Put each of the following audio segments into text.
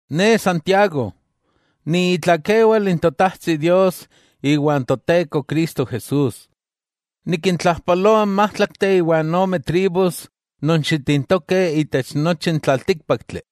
Ne, Santiago (Jacobo), ni itlakewal n Totajtsi Dios iwa n Toteko Cristo Jesús, nikintlajpaloa n májtlakteh iwa n ome tribus non xitintokeh itech nochi n tlaltíkpaktli.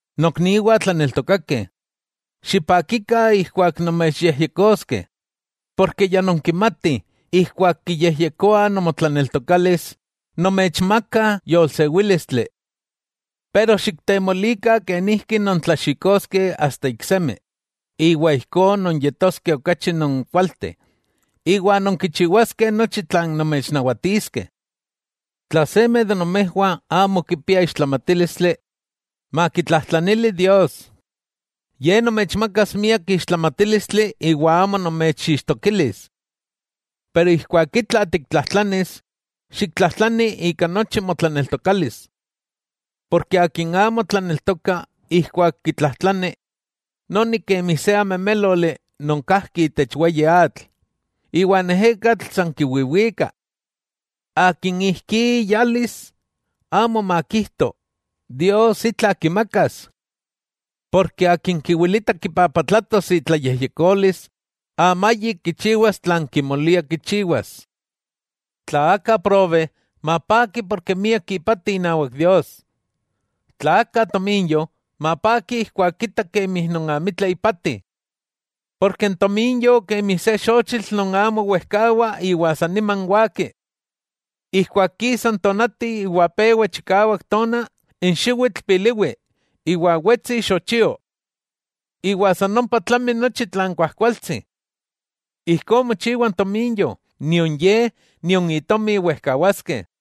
Nokniwah tlaneltokakeh, xipakikah ijkuak nomechyejyekoskeh. Porke ya nonkimatih ijkuak kiyejyekoa nomotlaneltokalis, nomechmakah yolsewílistli. Pero xiktemolikah kenijki nontlaxikoskeh asta iksemi, iwa ijkó nonyetoskeh okachi non kualteh iwa nonkichiwaskeh nochi tlan nomechnawatiskeh. Tla seme de nomejwah amo kipia ixtlamatílistli, makitlajtlanili Dios. Ye nomechmakas miak ixtlamatílistli iwa amo nomechixtokilis. Pero, ijkuak itla tiktlajtlanis, xiktlajtlani ika nochi motlaneltokalis. Porke akin amo tlaneltoka ijkuak kitlajtlani, noni kemi se ameméloli non kajki itech weyi atl, iwa n ejekatl san kiwiwika. Akin ijkí iyalis, amo makijto, Dios itla kimakas. Porke akin kiwilita kipapatlatos itlayejyekolis, amayik kichiwas tlan kimolia kichiwas. Tla aka probe, mapaki porke miak ipati inawak Dios. Tla aka tominyo, mapaki ijkuak kita kemi non amitla ipati. Porke n tominyo kemi se xochitl non amo wejkawa iwa saniman waki. Ijkuak kisa n tonati iwa pewa chikawak tona, n xiwitl piliwi iwa wetsi ixochio. Iwa san ompa tlami nochi tlan kuajkualtsi. Ijkó mochiwa n tominyo, nion ye, nion itomi wejkawaskeh.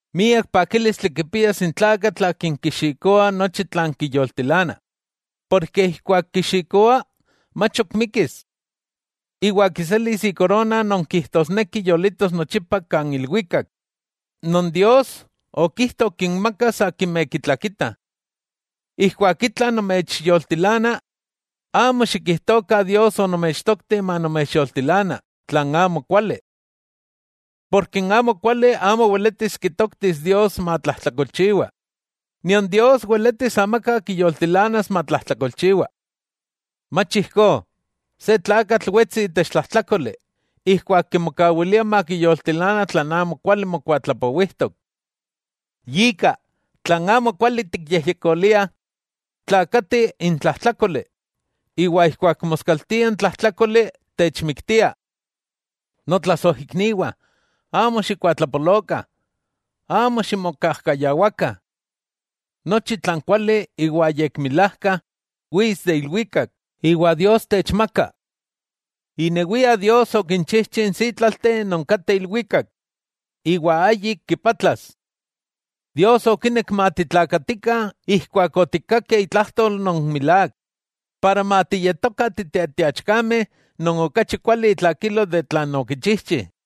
Miak pakílistli kipias n tlakatl akin kixikoa nochi tlan kiyoltilana, porke ijkuak kixikoa, mach ok mikkis. Iwa kiselis ikorona non kijtosneki yolitos nochipa kan ilwikak, non Dios okijto kinmakas akimeh kitlakitah. Ijkuak itla nomechyoltilana, amo xikijtokah Dios onomechtokti manomechyoltilana tlan amo kuali. Porke n amokuali amo weletis kitoktis Dios matlajtlakolchiwa, nion Dios weletis amaka kiyoltilanas matlajtlakolchiwa. Mach ijkó, se tlakatl wetsi itech tlajtlákoli ijkuak kimokawilia makiyoltilana tlan amokuali mokuatlapowijtok. Yika, tlan amokuali tikyejyekolia tlaakati n tlajtlákoli, iwa ijkuak moskaltia n tlajtlákoli techmiktia. Notlasojikniwah, amo xikuatlapolokah, amo ximokajkayawakah. Nochi tlan kuali iwa yekmilajka wits de ilwikak iwa Dios techmaka. Inewia Dios okinchijchi n sítlalteh non kateh ilwikak, iwa ayik kipatlas. Dios okinek matitlaakatikah ijkuak otikkakeh itlajtol non milák, para matiyetokah titetiachkameh non okachi kuali itlakilo tlan okichijchi.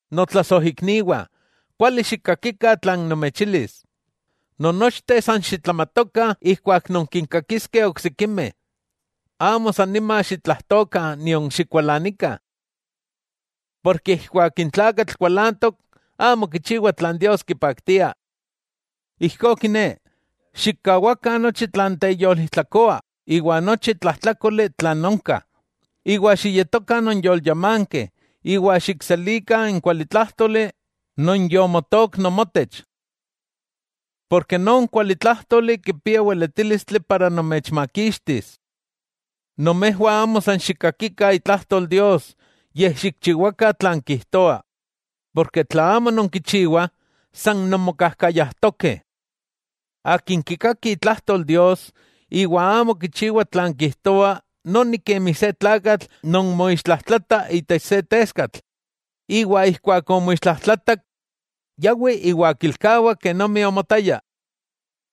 Notlasojikniwah, kuali xikkakikah tlan nomechilis: Nonnochteh san xitlamatokah ijkuak nonkinkakiskeh oksikimeh, amo san nima xitlajtokah nion xikualanikah. Porke ijkuak se tlakatl kualantok, amo kichiwa tlan Dios kipaktia. Ijkó kiné, xikkawakah nochi tlan teyolijtlakoa iwa nochi tlajtlákoli tlan onka, iwa xiyetokah nonyolyamankeh, iwa xikselikah n kualitlájtoli non yomotook nomotech. Porke non kualitlájtoli kipia weletílistli para nomechmakixtis. Nomejwah amo san xikkakikah itlajtol Dios, yej xikchiwakah tlan kijtoa, porke tla amo nonkichiwah san nonmokajkayajtokeh. Akin kikaki itlajtol Dios, iwa amo kichiwa tlan kijtoa, noni kemi se tlakatl non moixtlajtlata itech se teskatl, iwa ijkuak omoixtlajtlatak, yawi iwa kilkawa kenomi omotaya.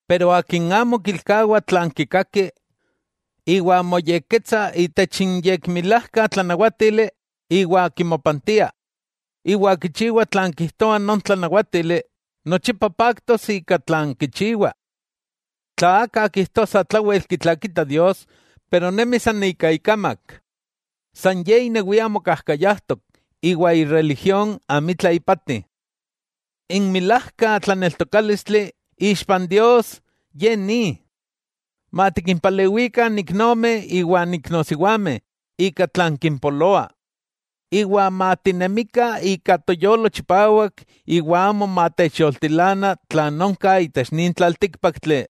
Pero akin amo kilkawa tlan kikaki, iwa moyekketsa itech n yekmilajka tlanawátili iwa kimopantia, iwa kichiwa tlan kijtoa non tlanawátili, nochipa paktos ika tlan kichiwa. Tla aka kijtoa satlawel kitlakita Dios pero nemi san ika ikamak, san ye inewia mokajkayajtok iwa ireligión amitla ipati. N milajka tlaneltokálistli ixpa n Dios ye ni: matikimpalewikah n iknomeh iwan iknosiwameh ika tlan kimpoloa, iwa matinemikah ika toyolo chipawak iwa amo matechyoltilana tlan onka itech nin tlaltíkpaktli.